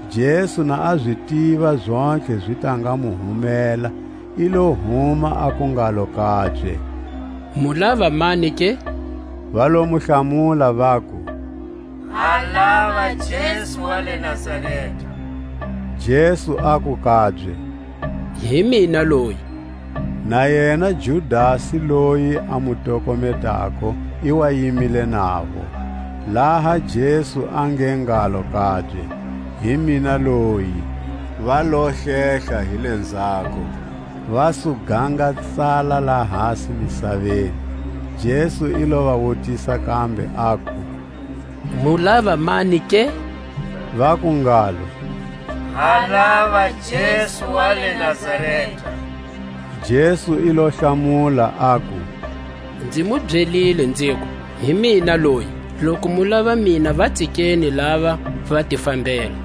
Jesu na a zi tiva zontlhe zi ta nga mu humela, i lo huma aku ngalo kabye: Mu lava mani ke? Va lo mu hlamula, vaku: Ha lava Jesu wa le Nazareta. Jesu aku kabye: Hi mina loyi. Na yena Judasi, loyi a mu tokometako, i wa yimile navo. Laha Jesu a nge ngalo kabye: Hi mina loyi, va lo hlehla hi lenzhako, va su gangatsala lahasi misaveni. Jesu i lo va wutisa kambe, aku: Mu lava mani ke? Vaku ngalo: Ha lava Jesu wa le Nazareta. Jesu i lo hlamula, aku: Nzimu byelile nziku: Hi mina loyi. Loku mu lava mina, va tsikeni lava, va ti fambela.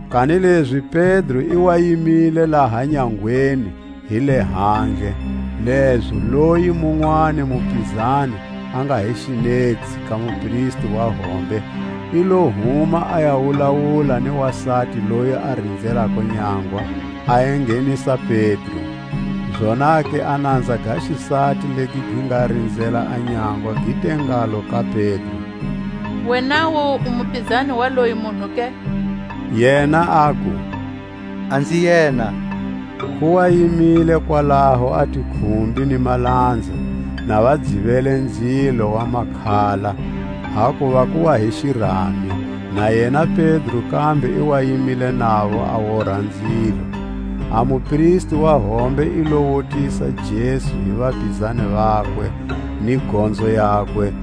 Kanilezi Pedro i wa yimile laha nyangweni hi lehandle. Lezo loyi munwani mupizani a nga hi xinetsi ka mupristi wa hombe, i lo huma a ya wulawula ni wasati loyi a rinzelako nyangwa, a enghenisa Pedro. Zonake a nanza ga xisati legi gi nga rinzela a nyangwa gi te ngalo ka Pedro: Wenawu u mupizani wa loyi munhu ke? Yena aku: A nzi yena. Ku wa yimile kwalaho a tikhumbi ni malanza, na va dzivele nzilo wa makhala; hakuva ku wa hi xirami; na yena Pedro kambe i wa yimile navo a wora nzilo. A mupristi wa hombe i lo wutisa Jesu hi vapizani vakwe, ni gonzo yakwe.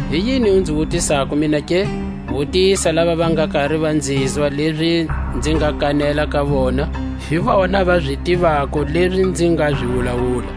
Hi yini u nzi wutisako mina ke? Wutisa lava va nga kari va nzizwa lezi nzi nga kanela ka vona; hi vona va zi tivako lezi nzi nga zi wulawula.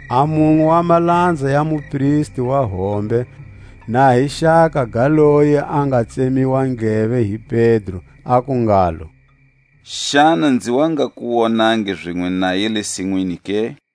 A munwe wa malanza ya mupristi wa hombe, na hi xaka ga loyi a nga tsemiwa ndleve hi Pedro, aku ngalo: Xana nzi wa nga ku wonangi zinwe naye le sinwini ke?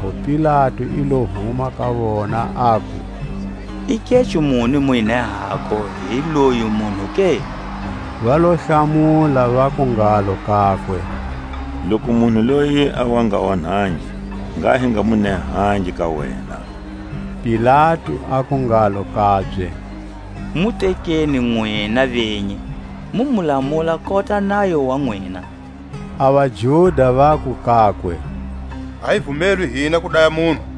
Hikwalaho Pilatu i lo huma ka vona, aku: I keco muni mu nehako hi loyi munhu ke? Va lo hlamula, vaku ngalo kakwe: Loku munhu loyi a wa nga onhangi, ngha hi nga mu nehangi ka wena. Pilatu aku ngalo kabye: Mu tekeni nwina venyi, mu mu lamula kota nayo wa nwina. A vaJuda vaku kakwe: A hi vumelwi hina ku daya munhu.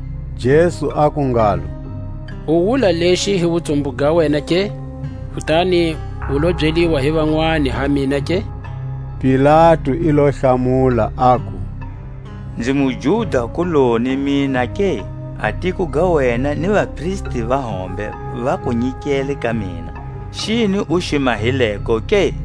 Jesu aku ngalo: U wula lexi hi wutsumbu ga wena ke, kutani u lo byeliwa hi vanwani ha mina ke? Pilatu i lo hlamula, aku: Nzi muJuda-kuloni mina ke? A tiko ga wena ni vapristi va hombe va ku nyikele ka mina; xini u xi mahileko ke?